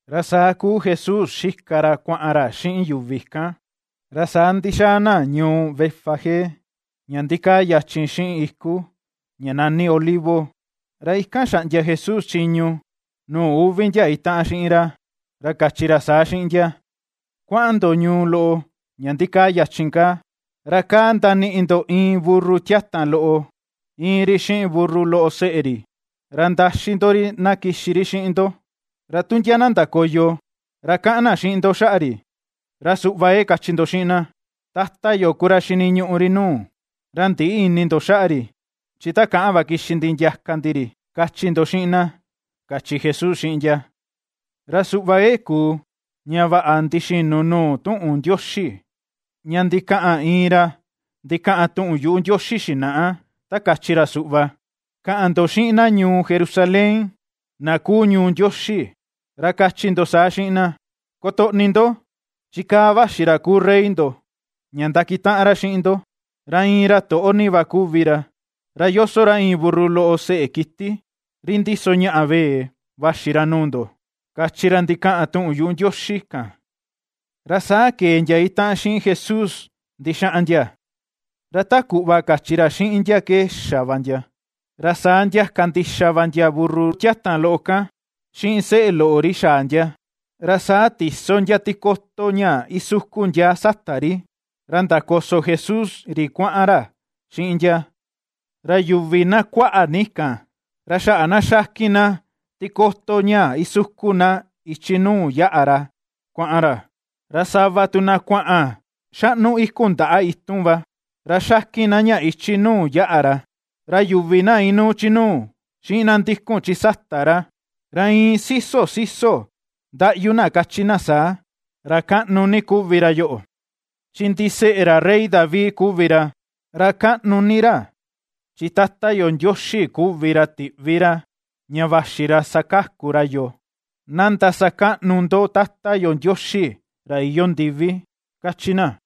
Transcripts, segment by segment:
Ra saa kuu Jesús xika ra kuaꞌan ra xiꞌin yuvi kan, ra saa ndixaa na ñuu Betfagé ña ndikaa yachin xiꞌin iku ña nani Olivo, ra ikan xaꞌndia Jesús chiñu nuu uvi ndia itaꞌan xiꞌin ra, ra kachi ra saa xiꞌin ndia: ―Kuaꞌan ndo ñuu loꞌo ña ndikaa yachin kaa, ra kaa ndaniꞌi ndo iin burru tiatan loꞌo íin ri xiꞌin burru loꞌo seꞌe ri, ra ndaxi ndo ri na kixi ri xiꞌin ndo. Ra tu ndia na ndakoyo, ra kaꞌan na xiꞌin ndo xaꞌa ri, ra suꞌva ke kachi ndo xiꞌin na: “Tata yo ku ra xiniñuꞌu ri nuu, ra ndïꞌi ini ndo xaꞌa ri chi takaꞌan va kixi ndi ndiaka ndi ri”, kachi ndo xiꞌin na ―kachi Jesús xiꞌin ndia. Ra suꞌva ke kuu ña vaꞌa ndixinu nuu tuꞌun Ndioxi ña ndikaꞌan iin ra ndikaꞌan tuꞌun yuꞌu Ndioxi xinaꞌa, ta kachi ra suꞌva: Kaꞌan ndo xiꞌin na ñuu Jerusalén na kuu ñuu Ndioxi, ra kachi ndo saa xiꞌin na: “Kotoꞌni ndo chi kaa vaxi ra kuu Rey ndo, ña ndakitaꞌan ra xiꞌin ndo, ra iin ra toꞌo ni va kuvi ra, ra yoso ra iin burru loꞌo seꞌe kiti ri ndiso ña vee vaxi ra nuu ndo”, kachi ra ndikaꞌan tuꞌun Ndioxi kan. Ra saa kee ndia itaꞌan xiꞌin Jesús ndixaꞌan ndia, ra ta kuꞌva kachi ra xiꞌin ndia ke xa va ndia. Ra saa ndiaka ndixa va ndia burru tiatan loꞌo kan xiꞌin seꞌe loꞌo ri xaa ndia, ra saa tiso ndia tikoto ña isukun ndia sata ri, ra ndakoso Jesús ri kuaꞌan ra xiꞌin ndia. Ra yuvi na kuaꞌa ni kan, ra xaꞌa na ^xakin na tikoto ña isukun na ichi nuu yaꞌa ra kuaꞌan ra, ra sava tu na kuaꞌan xaꞌnu iku ndaꞌa itun va, ra xakin na ña ichi nuu yaꞌa ra. Ra yuvi na inuu chi nuu, xiꞌin na ndikun chi sata ra, ra iin siso siso ndaꞌyu na kachi na saa: ―¡Ra kaꞌnu ni kuvi ra yoꞌo!, chi ndiseꞌe ra Rey David kuvi ra; ¡ra kaꞌnu ni ra, chi Tata yo Ndioxi kuvi ra tiꞌvi ra ña vaxi ra sakaku ra yoo! ¡Na ndasakaꞌnu ndo Tata yo Ndioxi ra iyoo ndivi! ―^kachi na.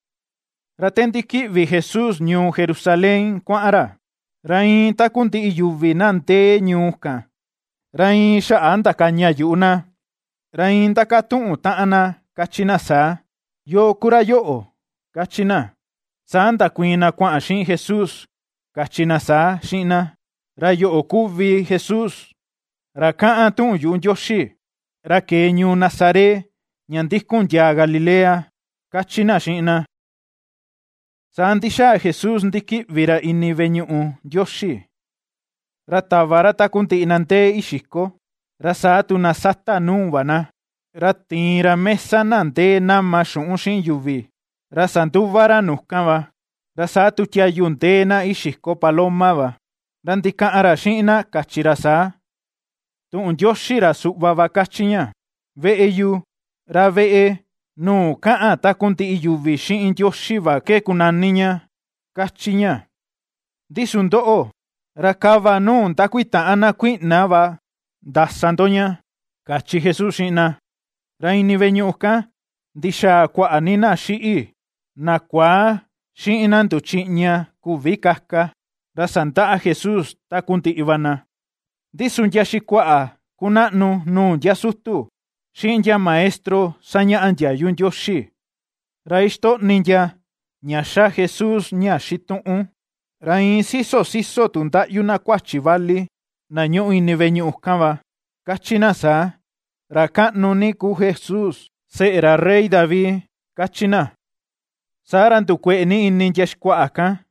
Ra te ndikiꞌvi Jesús ñuu Jerusalén kuaꞌan ra, ra iin takundiꞌi yuvi na ndee ñuu kan, ra iin xaꞌa ndakaña yuꞌu na, ra iin ndakatuꞌun taꞌan na kachi na saa: ―¿Yoo ku ra yoꞌo? ―kachi na. Saa ndakuiin na kuaꞌan xiꞌin Jesús kachi na saa xiꞌin na: ―Ra yoꞌo kuvi Jesús ra kaꞌan tuꞌun yuꞌu Ndioxi, ra kee ñuu Nazaret ña ndikun ndiaa Galilea ―kachi na xiꞌin na. Saa ndixaa Jesús ndikiꞌvi ra ini veꞌe ñuꞌu Ndioxi, ra tava ra takundiꞌi na ndee ixiko, ra saa tu na sata nuu va na, ra tiin ra mesa na ndee nama xuꞌun xiꞌin yuvi, ra sanduva ra nu kan va, ra saa tu tiayu tu ndee na ixiko paloma va; ra ndikaꞌan ra xiꞌin na kachi ra saa: ―Tuꞌun Ndioxi ra suꞌva va kachi ña: “Veꞌe yu, ra veꞌe nuu kaꞌan takundiꞌi yuvi xiꞌin Ndioxi va ke kunani ña”, ^kachi ña, ndi su ndoꞌo, ra kava nuu ndakuitaꞌan na kuiꞌna va ndasa ndo ña ―kachi Jesús xiꞌin na. Ra ini veꞌe ñuꞌu kan ndixaa kuaꞌa ni na xiꞌi, na kuaa, xiꞌin na nduchiꞌña küvi kaka, ra sandaꞌa Jesús takundiꞌi va na. Ndi su ndia xikuaꞌa kunaꞌnu nuu ndia sutu, xiꞌin ndia maestro sañaꞌa ndiayu Ndioxi, ra ixtoꞌni ndia ña ^xa Jesús ña xituꞌun, ra iin siso siso tu ndaꞌyu na kuachi vali na ñúꞌu ini veꞌe ñuꞌu kan va, ^kachi na saa: “¡Ra kaꞌnu ni kuu Jesús seꞌe ra Rey David!”, ^kachi na. Saa ra ndukueꞌe ni ini ndia xikuaꞌa kan,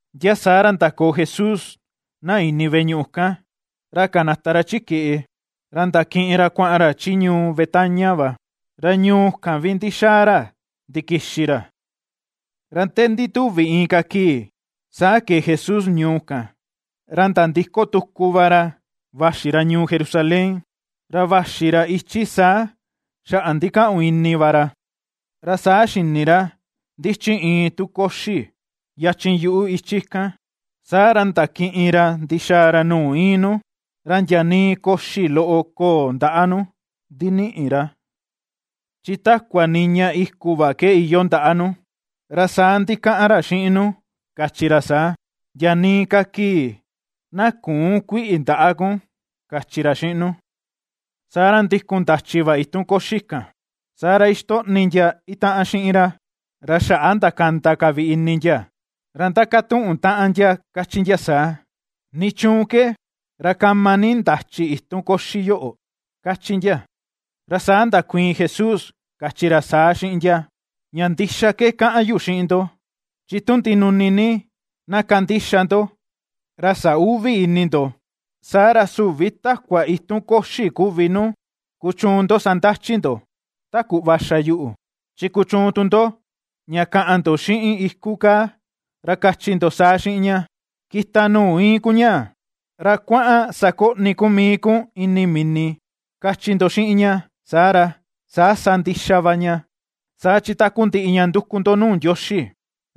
Ndia saa ra ndakoo Jesús ndia ini veꞌe ñuꞌu kan, ra kanata ra chi keꞌe, ra ndakiꞌin ra kuaꞌan ra chi ñuu Betania va, ra ñuu kan vi ndixaa ra ndikixi ra. Ra te ndituvi inka kii saa kee Jesús ñuu kan, ra nandiko tuku va ra vaxi ra ñuu Jerusalén, ra vaxi ra ichi saa xaꞌa ndikaꞌun ini va ra. Ra saa xini ra ndichi iin tu koxi yachin yuꞌu ichi kan, saa ra ndakiꞌin ra ndixaa ra nuu íin nu, ra ndia nii koxi loꞌo köo ndaꞌa nu ndiniꞌi ra, chi takua niña iku va ke iyoo ndaꞌa nu, ra saa ndikaꞌan ra xiꞌin nu kachi ra saa: ―Ndia nii ka kii na küun kuiꞌi ndaꞌa kun ―kachi ra xiꞌin nu. Saa ra ndikun ndachi va itun koxi kan. Saa ra ixtoꞌni ndia itaꞌan xiꞌin ra, ra xaꞌa ndakanda ka vi ini ndia, ra ndakatuꞌun taꞌan ndia kachi ndia saa: ―¿Nichuun ke, ra kama ni ndachi itun koxi yoꞌo? ―kachi ndia. Ra saa ndakuiin Jesús kachi ra saa xiꞌin ndia: ―Ña ndixa ke kaꞌan yu xiꞌin ndo, chi tu ndinuni ni na kandixa ndo, ra sä uvi ini ndo, saa ra süvi takua itun koxi kuvi nu kuchuun ndo sandachi ndo, ta kuꞌva xa yuꞌu, chi kuchuun tu ndo, ña kaꞌan ndo xiꞌin iku kaa ra kachi ndo saa xiꞌin ña: “Kita nuu iin kun ñaa, ra kuaꞌan sakoꞌni kun mii kun ini mini”, kachi ndo xiꞌin ña, saa ra, saa sa ndixa va ña. Saa chi takundiꞌi ña nduku ndo nuu Ndioxi,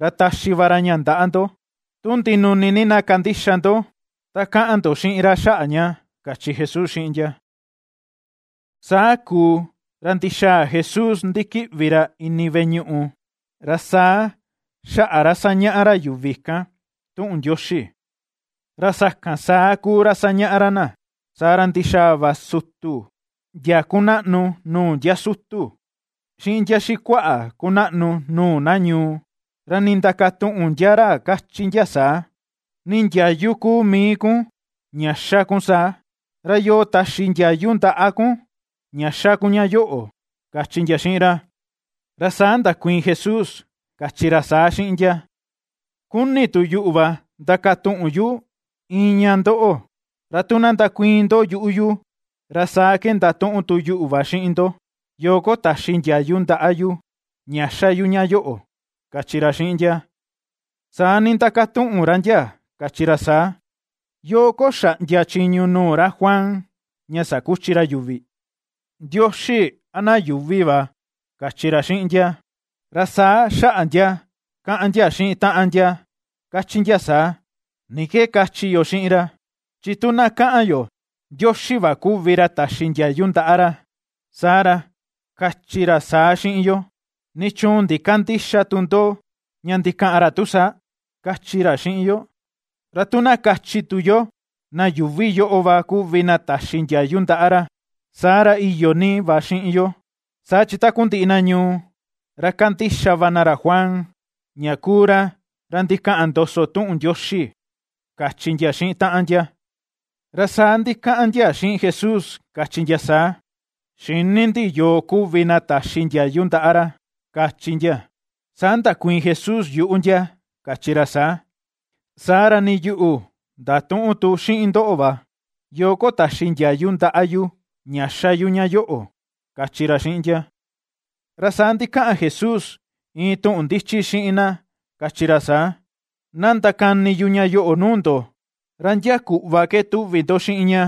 ra taxi va ra ña ndaꞌa ndo, tu ndinuni ni na kandixa ndo ta kaꞌan ndo xiꞌin ra xaꞌa ña ―kachi Jesús xiꞌin ndia. Saa kuu ra ndixaa Jesús ndikiꞌvi ra ini veꞌe ñuꞌu, ra saa xaꞌa ra sañaꞌa ra yuvi kan tuꞌun Ndioxi; ra sakan saa kuu ra sañaꞌa ra na, saa ra ndixaa va sutu ndia kunaꞌnu nuu ndia sutu, xiꞌin ndia xikuaꞌa kunaꞌnu nuu na ñuu, ra nindakatuꞌun ndia ra kachi ndia saa: ―¿Ni ndiayu ku mii kun ña xa kun saa? ¿Ra yoo taxi ndiayu ndaꞌa kun ña xa kun ña yoꞌo? ―kachi ndia xiꞌin ra. Ra saa ndakuiin Jesús kachi ra saa xiꞌin ndia: ―Kuni tu yuꞌu va ndakatuꞌun yu iin ña ndoꞌo, ra tu na ndakuiin ndo yuꞌu yu, ra saa ke ndatuꞌun tu yuꞌu va xiꞌin ndo, yoo ko taxi ndiayu ndaꞌa yu ña xa yu ña yoꞌo ―kachi ra xiꞌin ndia. Saa nindakatuꞌun ra ndia kachi ra saa: ―¿Yoo ko xaꞌndia chiñu nuu ra Juan ña sakuchi ra yuvi? ¿Ndioxi, a na yuuvi va? ―kachi ra xiꞌin ndia. Ra saa xaꞌa ndia kaꞌan ndia xiꞌin taꞌan ndia kachi ndia saa: ―¿Ni ke kachi yo xiꞌin ra? Chi tu na kaꞌan yo: “Ndioxi va kuvi ra taxi ndiayu ndaꞌa ra”, saa ra, kachi ra saa xiꞌin yo: “¿Nichuun ndikandïxa tu ndo ña ndikaꞌan ra tu saa?”, kachi ra xiꞌin yo. Ra tu na kachi tu yo: “Na yuuvi yoꞌo va kuvi na taxi ndiayu ndaꞌa ra”, saa ra iyo ni va xiꞌin yo, saa chi takundiꞌi na ñuu, ra kandixa va na ra Juan, ña kuu ra, ra ndikaꞌan ndoso tuꞌun Ndioxi ―kachi ndia xiꞌin taꞌan ndia. Ra saa ndikaꞌan ndia xiꞌin Jesús kachi ndia saa: ―Xïni ndi yoo kuvi na taxi ndiayu ndaꞌa ra ―kachi ndia. Saa ndakuiin Jesús yuꞌu ndia kachi ra saa: ―Saa ra nii yuꞌu ndatüꞌun tu xiꞌin ndoꞌo va, yoo ko taxi ndiayu ndaꞌa yu ña ^xa yu ña yoꞌo ―kachi ra xiꞌin ndia. Ra saa ndikaꞌan Jesús iin tuꞌun ndichi xiꞌin na kachi ra saa: ―Na ndakani yu ña yoꞌo nuu ndo, ¿ra ndia kuꞌva ke tuvi ndo xiꞌin ña?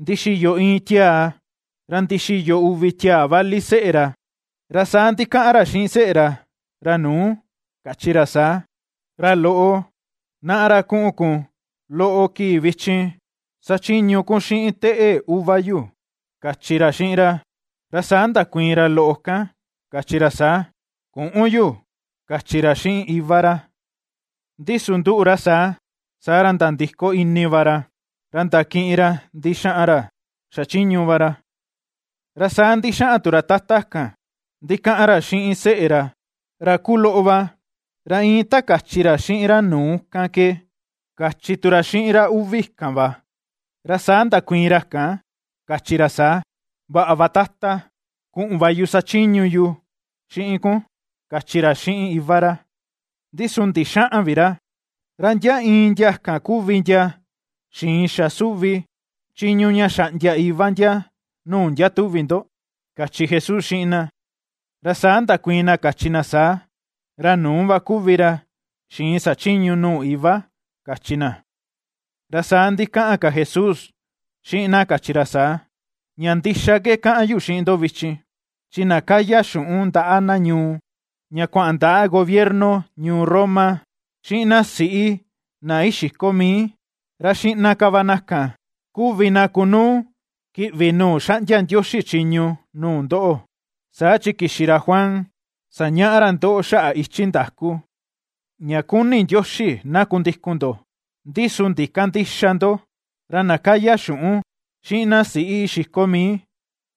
Ndixiyo iin tiaa, ra ndixiyo uvi tiaa vali seꞌe ra, ra saa ndikaꞌan ra xiꞌin seꞌe ra, ra nuu, kachi ra saa: “Ra loꞌo, naꞌa, ra kuꞌun kun loꞌo kii vichin sachiñu kun xiꞌin teꞌe uva yu”, kachi ra xiꞌin ra. Ra saa ndakuiin ra loꞌo kan kachi ra saa: “Küꞌun yu”, kachi ra xiꞌin iva ra. Ndi su nduꞌu ra saa, saa ra nandiko ini va ra, ra ndakiꞌin ra ndixaꞌan ra xachiñu va ra. Ra saa ndixaꞌan tu ra tata kan ndikaꞌan ra xiꞌin seꞌe ra, ra kuloꞌo va, ra iin ta kachi ra xiꞌin ra nuu kan ke kachi tu ra xiꞌin ra uvi kan va. Ra saa ndakuiin ra kan kachi ra saa: “Vaꞌa va, tata, kuꞌun va yu sachiñu yu xiꞌin kun”, kachi ra xiꞌin iva ra, ndi su ndixäꞌan vi ra. ¿Ra ndia iin ndia kan kuvi ndia xiin xa suvi chiñu ña xaꞌndia iva ndia nuu ndia, tuvi ndo? ―kachi Jesús xiꞌin na. Ra saa ndakuiin na kachi na saa: ―Ra nuu va ku ra xiin xachiñu nuu iva ―kachi na. Ra saa ndikaꞌan ka Jesús xiꞌin na kachi ra saa: ―Ña ndixa ke kaꞌan yu xiꞌin ndo vichin, chi na kaya xuꞌun ndaꞌa na ñuu, ña kuaꞌan ndaꞌa gobierno ñuu Roma, xiꞌin na siꞌi na ixiko mii, ra xiꞌna ka va na kan kuvi na kunuu kiꞌvi nuu xaꞌndia Ndioxi chiñu nuu ndoꞌo. Saa chi kixi ra Juan sañaꞌa ra ndoꞌo xaꞌa ichi ndaku ña kuni Ndioxi na kundikun ndo, ndi su ndikandïxa ndo; ra na kaya xuꞌun, xiꞌin na siꞌi ixiko mii,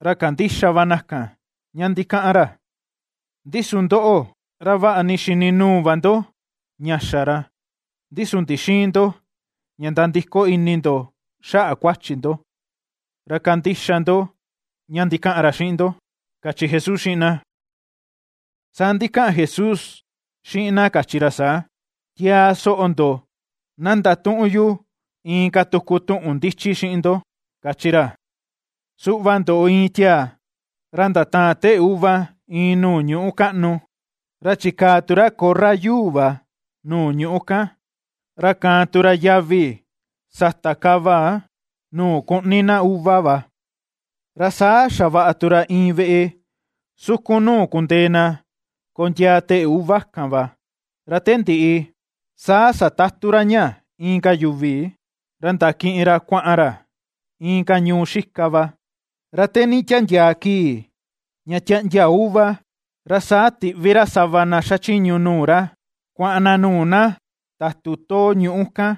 ra kandixa va na kan ña ndikaꞌan ra. Ndi su ndoꞌo, ra vaꞌa ni xini nuu va ndo ña xa ra, ndi su ndixïin ndo ña nandiko ini ndo xaꞌa kuachi ndo, ra kandixa ndo ña ndikaꞌan ra xiꞌin ndo ―kachi Jesús xiꞌin na. Saa ndikaꞌan Jesús xiꞌin na kachi ra saa: ―Tiaa soꞌo ndo na ndatuꞌun yu inka tuku tuꞌun ndichi xiꞌin ndo kachi ra: Suꞌva ndoꞌo iin tiaa, ra ndataan teꞌe uva iin nuu ñuꞌu kaꞌnu, ra chikaa tu ra korra yuu va nuu ñuꞌu kan, ra kaan tu ra yavi sata kava nuu kuꞌni na uva va, ra saa xavaꞌa tu ra iin veꞌe sukun nuu kundee na kondiaa teꞌe uva kan va. Ra te ndiꞌi, saa satatu ra ña inka yuvi, ra ndakiꞌin ra kuaꞌan ra inka ñuu xika va. Ra te nditiandiaa kii ña tiaꞌndia uva, ra saa tiꞌvi ra sava na xachiñu nuu ra kuaꞌan na nuu na tatu too ñuꞌu kan,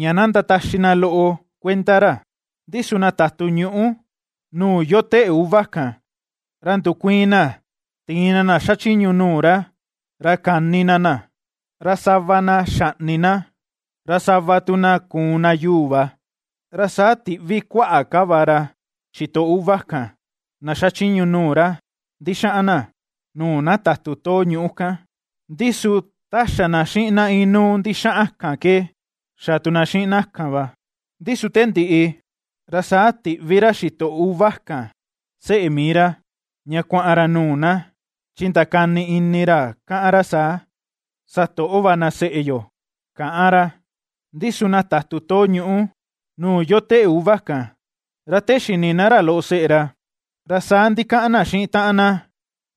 ña na ndataxi na loꞌo kuenda ra. Ndi su na tatu ñuꞌu nuu yoo teꞌe uva kan, ra ndukuiin na tiin na na xachiñu nuu ra, ra kani na na, ra sava na xaꞌni na, ra sava tu na kuun na yuu va. Ra saa tiꞌvi kuaꞌa ka va ra xitoꞌo uva kan, na xachiñu nuu ra ndixaꞌan na, nuu na tatu too ñuꞌu kan, ndi su ta xa na xiꞌin na inuu ndixaꞌan kan ke, xa tu na xiꞌin na kan va. ’Ndi su te ndiꞌi, ra saa tiꞌvi ra xitoꞌo uva kan seꞌe mii ra, ña kuaꞌan ra nuu na, chi ndakani ini ra kaꞌan ra saa: “Satoꞌo va na seꞌe yo”, káꞌán ra. Ndi su na tatu too ñuꞌu nuu yoo teꞌe uva kan, ra te xini na ra loꞌo seꞌe ra, ra saa ndikaꞌan na xiꞌin taꞌan na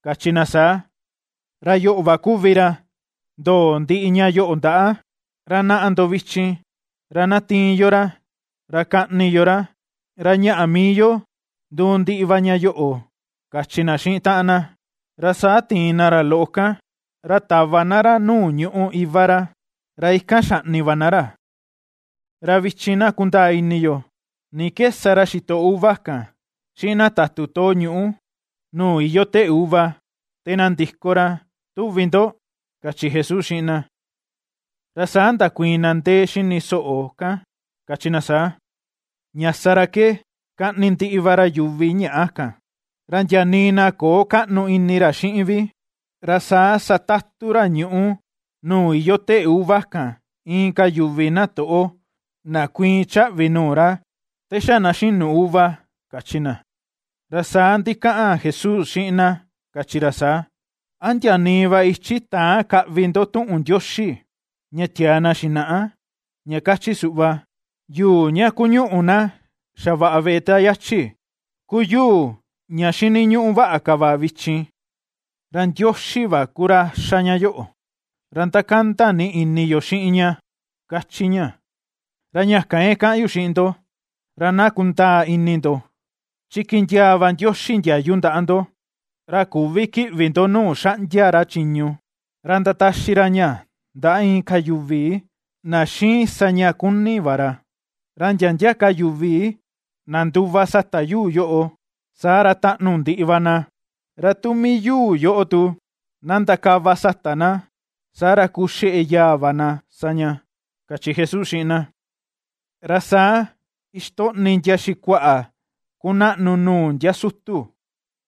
kachi na saa: “Ra yoꞌo va kuvi ra ndoo ndiꞌi ña yoꞌo ndaꞌa; ra naꞌa ndo vichin ra tiin yo ra, ra kaꞌni yo ra, ra ñaꞌa mii yo nduu ndiꞌi va ña yoꞌo”, kachi na xiꞌin taꞌan na. Ra saa tiin na ra loꞌo kan, ra tava na ra nuu ñuꞌu iva ra, ra ikan xaꞌni va na ra. Ra vichin na kundaa ini yo: ¿Ni ke sa ra xitoꞌo uva kan, xiꞌin na tatu too ñuꞌu nuu yoo teꞌe uva, te na ndiko ra, tuvi ndo? ―kachi Jesús xiꞌin na. Ra saa ndakuiin na ndee xini soꞌo kan kachi na saa: ―Ña sa ra ke, kaꞌni ndiꞌi va ra yuvi ñaꞌa kan, ra ndia nii na köo kaꞌnu ini ra xiꞌin vi, ra saa satatu ra ñuꞌu nuu yoo teꞌe uva kan inka yuvi na toꞌo, na kuiin chaꞌvi nuu ra, te xa na xinu uva ―kachi na. Ra saa ndikaꞌan Jesús xiꞌin na kachi ra saa: ―¿A ndia nii va ichi täan kaꞌvi ndo tuꞌun Ndioxi ña tiaa na xinaꞌa, ña kachi suꞌva?: Yuu ña kuñuꞌu na xavaꞌa veꞌe ta yachi kuu yuu ña xiniñuꞌu vaꞌa ka va vichin. Ra Ndioxi va ku ra xa ña yoꞌo, ra ndakanda ni ini yo xiꞌin ña, ^kachi ña. ’Ra ña kan ke kaꞌan yu xiꞌin ndo, ra na kundaa ini ndo: chi kindiaa va Ndioxi ndiayu ndaꞌa ndo ra küvi kiꞌvi ndo nuu xaꞌndia ra chiñu, ra ndataxi ra ña ndaꞌa inka yuvi na xiin sa ña kuni va ra. Ra ndia ndia ka yuvi na nduva sata yuu yoꞌo, saa ra taꞌnu ndiꞌi va na; ra tu mii yuu yoꞌo tu na ndakava sata na, saa ra kuu xeꞌe yaa va na sa ña ―kachi Jesús xiꞌin na. Ra saa ixtoꞌni ndia xikuaꞌa kunaꞌnu nuu ndia sutu,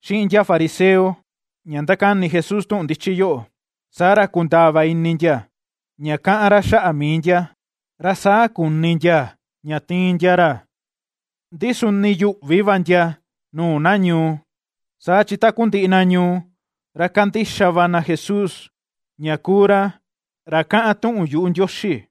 xiꞌin ndia fariseo, ña ndakani Jesús tuꞌun ndichi yoꞌo, saa ra kundaa va ini ndia, ña kaꞌan ra xaꞌa mii ndia. Ra saa kuni ndia ña tiin ndia ra, ndi su ndiyuꞌvi va ndia nuu na ñuu, saa chi takundiꞌi na ñuu, ra kandixa va na Jesús, ña kuu ra, ra kaꞌan tuꞌun yuꞌu Ndioxi.